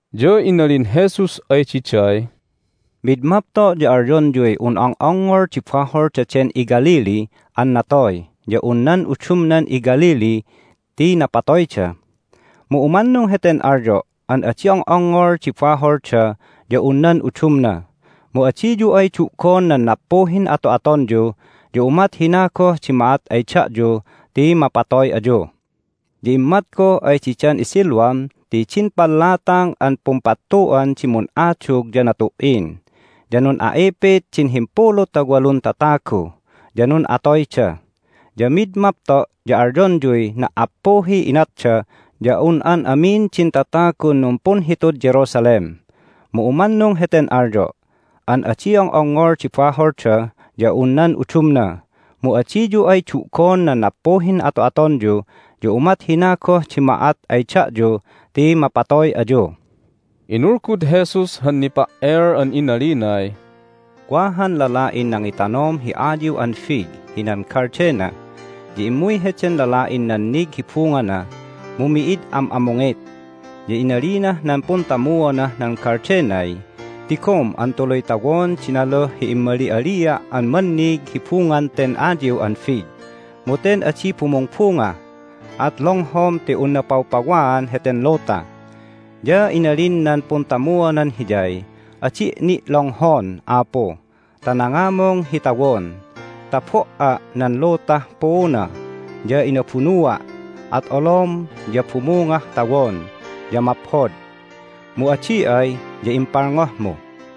Ya inalin Jesus ay diday, "Mid mapto' ya alyonyuy un ong'ongngol di bahol daden iGalilee an natoy ya un nan udumnan iGalilee ti napatoyda. Mu umannung heten alyo' an adi ong'ongngol di baholda ya un nan udumna. Mu adiyu ay du'gon nan nappuhin ato'atonyu ya umat hina goh di ma'at ay da'yu ti mapatoy ayu. Ya immat goh ay didan iSiloam ti din pallatang an pumpattu'an di mun'adug ya natu"in, ya nun'a'ipit din himpulu ta walun tatagu, ya nun'atoyda. Ya mid mapto' ya alyonyuy na"appuhiy inatda ya un an amin din tatagun numpunhitud Jerusalem. Mu umannung heten alyo' an adi ong'ongngol di baholda ya un nan udumna. Mu adiyu ay du'gon nan nappuhin ato'atonyu ya umat hina goh di ma'at ay da'yu ti mapatoy ayu." Inulgud Jesus han nipa"el an inalinay, "Wa han lala'in nangitanom hi ayiw an fig hinan galdena. Ya immuy heden lala'in nannig hi bungana, mu mi'id am'amungit. Ya inalinah nan puntamuonah nan galdenay, Tigom an tuluy tawon di naluh hi immali'alia' an mannig hi bungan ten ayiw an fig, mu ten adi bumungbunga. At longhom ti unna pawpawaan heten luta! Ya inalin nan puntamuonan hiyay, Adi' ni' longhon, apu, ta nangamung hi tawon ta bo"a' nan lutah puuna, ya inabunua', at olom ya bumungah tawon, ya maphod. Mu adi ay ya impalngohmu."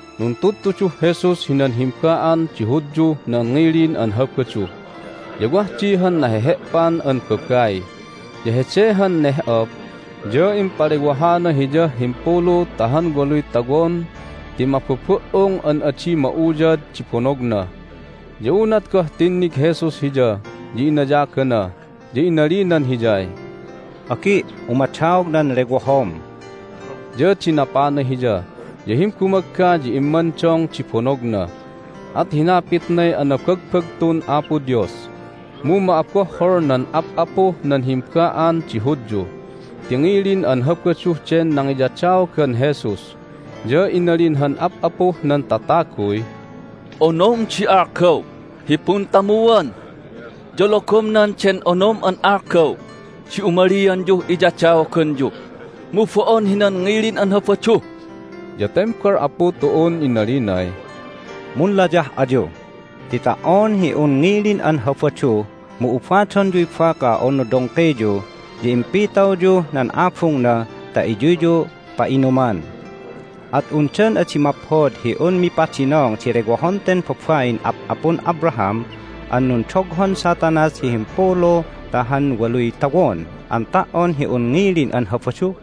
Nuntudtuduh Jesus hinan himba'an di Hudyuh nan ngilin an Habadu. Ya wah di han nahehe'pan an babai. Ya hede han neh'op ya impalewahana hiyah himpulu ta han waluy tawon ti mabubu"ung an adi ma'uyad di bonogna. Ya unat goh tinnig Jesus hiya ya inayagana, ya inalinan hiyay, "Agi', umadaog nan lewohom." Ya dinapana hiya, ya himbumagga ya immandong di bonogna, at hinapitnay anabagbagtun Apo Dios. Mu ma'abohhol nan ap'apuh nan himba'an di Hudyu ti ngilin an Habadu den nangiyadaogan Jesus. Ya inalin han ap'apuh nan tataguy, "Onom di algaw hi puntamuan, ya logomnan den onom an algaw di umalianyuh iyadaoganyu, mu bo'on hinan ngilin an Habadu!" Ya tembal Apu tu'un inalinay, "Munlayah ayu! Ti ta"on hi un ngilin an Habadu mu ubadonyuy baka unu dongkiyu, ya impitawyuh nan abungna ta iyuyyu pa'inuman. At undan adi maphod hi un mipadinong di lewohon ten babain ap'apun Abraham an nundoghon Satanas hi himpulu ta han waluy tawon an ta"on hi un ngilin an Habadu?"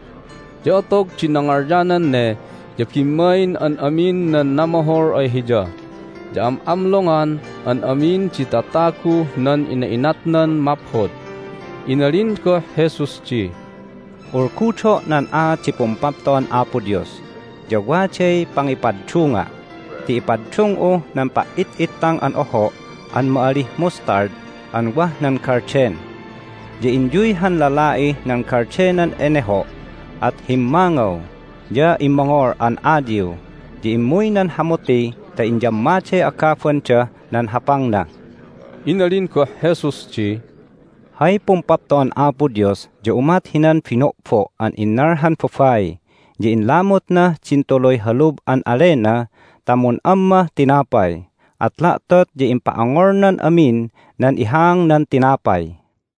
Ya otog di nangalyanan ne ya bimmain an amin nan namohol ay Hiya, ya am'amlongan an amin di tatagu nan ina'inatnan maphod. Inalin goh Jesus di, "Ulgudo' nan aat di Pumpapto'an Apo Dios, ya waday pangipaddunga' ti ipaddung'uh nan pa"it'ittang an oho' an ma'alih mustard an wah nan galden. Ya inyuy han lala'ih nan galdenan eneho', at himmangaw, ya immongol an ayiw, ya immuy nan hamuti ta inyammaday agabandah nan hapangna." Inalin goh Jesus di, "Hay Pumpapto'an Apo Dios ya umat hinan bino'bo' an innal han babai, ya inlamutnah din tuluy halub an alena ta mun'ammah tinapay, at la'tot ya impa'ongolnan amin nan ihaangnan tinapay."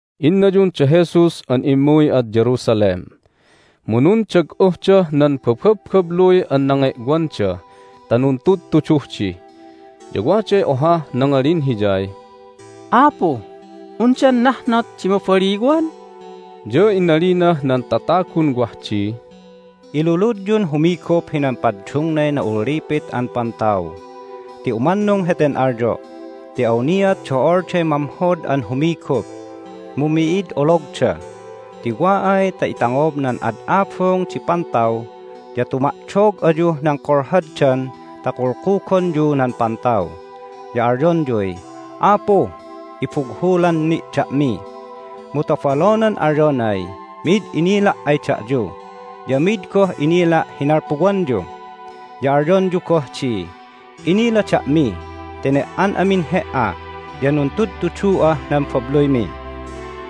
Innayun da Jesus an immuy ad Jerusalem, mu nundag'uhdah nan bababbabluy an nange'wanda ta nuntudtuduh di. Ya waday ohah nangalin Hiyay, "Apu, undan nahnot di mabaliwan?" Ya inalinah nan tatagun wah di, "Iluludyun humigup hinan paddungnay na'ullipit an pantaw. Ti umannung heten alyo' ti awniat do'olday mamhod an humigup, mu mi'id ologda. Ti wa ay ta itangob nan ad abung di pantaw ya tuma'dog ayuh nan kolhoddan ta kulkugonyu nan pantaw, ya alyonyuy, Apu, ibughulan ni' da'mi! Mu tobolonan alyonay, Mi'id inila' ay da'yu, ya mid goh inila' hi nalpuwanyu! Ya alyonyu goh di, Inila da'mi ti ne"an amin He"a, ya nuntudtudu'ah nan babluymi!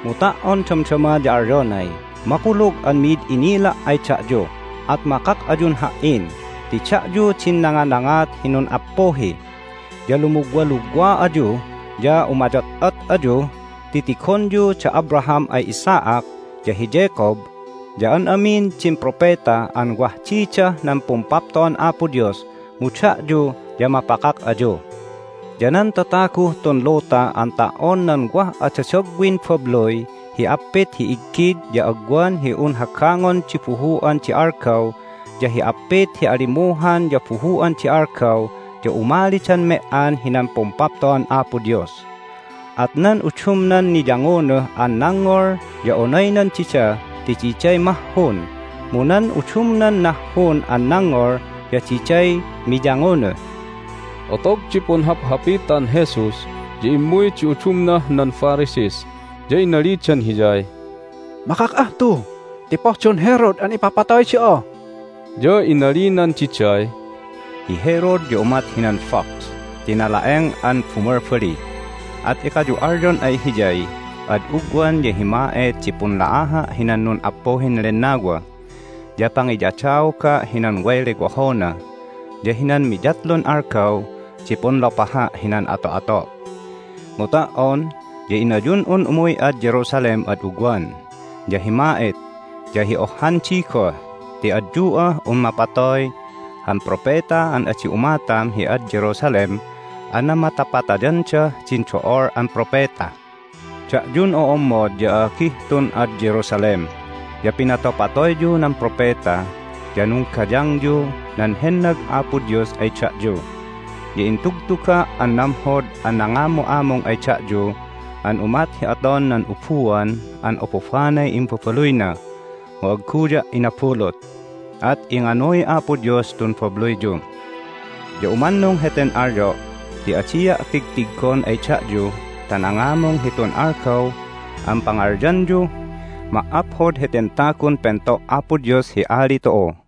Mu ta"on damdama ya alyonay, Makulug an mi'id inila' ay da'yu, at makak ayun Ha"in ti da'yu din nanganangat hi nun'appuhi! Ya lumugwalugwa ayu, ya umayot'ot ayu ti tigonyu da Abraham ay Isaac, ya hi Jacob, ya an amin din propeta an wah didah nan Pumpapto'an Apo Dios, mu da'yu ya mapakak ayu! Ya nan tataguh tun luta an ta"on nan wah adadagwin babluy hi appit hi iggid ya agwan hi un hagangon di buhu'an di algaw, ya hi appit hi alimuhan ya buhu'an di algaw ya umalidan me"an hinan Pumpapto'an Apo Dios. At nan udumnan niyangunuh an nangngol ya onaynan dida ti diday mahhun, mu nan udumnan nahhun an nangngol ya diday miyangunuh." Otog di punhaphapitan Jesus ya immuy di udumnah nan Pharisees, ya inalidan Hiyay, "Makak'ah tu ti pohdon Herod an ipapatoy da'a!" Ya inalinan diday, "Hi Herod ya umat hinan fox ti nala'eng an bumalbali, at ekayu alyon ay hiyay, Ad ugwan ya hi ma'et di punla'aha' hinan nun'appuhin lennawa, ya pangiyadaoga' hinan way lewohona, ya hinan miyatlun algaw di punlopaha' hinan ato'ato'. Mu ta"on ya inayun'un umuy ad Jerusalem ad ugwan, ya hi ma'et, ya hi ohhandi goh ti adyu'ah un mapatoy han propeta an adi umatam hi ad Jerusalem an namatapatayandah din do'ol an propeta! Da'yun o'ommod ya a'agih tun ad Jerusalem ya pinatopatoyyu nan propeta, ya nunggayangyu nan hennag Apo Dios ay da'yu! Ya intugtuga' an namhod an nangamu'amung ay da'yu an umat hi aton nan ubuan an obobanay imbabaluyna, mu agguya' inabulut! At inganuy Apo Dios tun babluyyu! Ya umannung heten alyo' ti adia' tigtiggon ay da'yu ta nangamung hitun algaw an pangalyanyuh, Ma"aphod heten tagun pento' Apo Dios hi Ali tu'u!"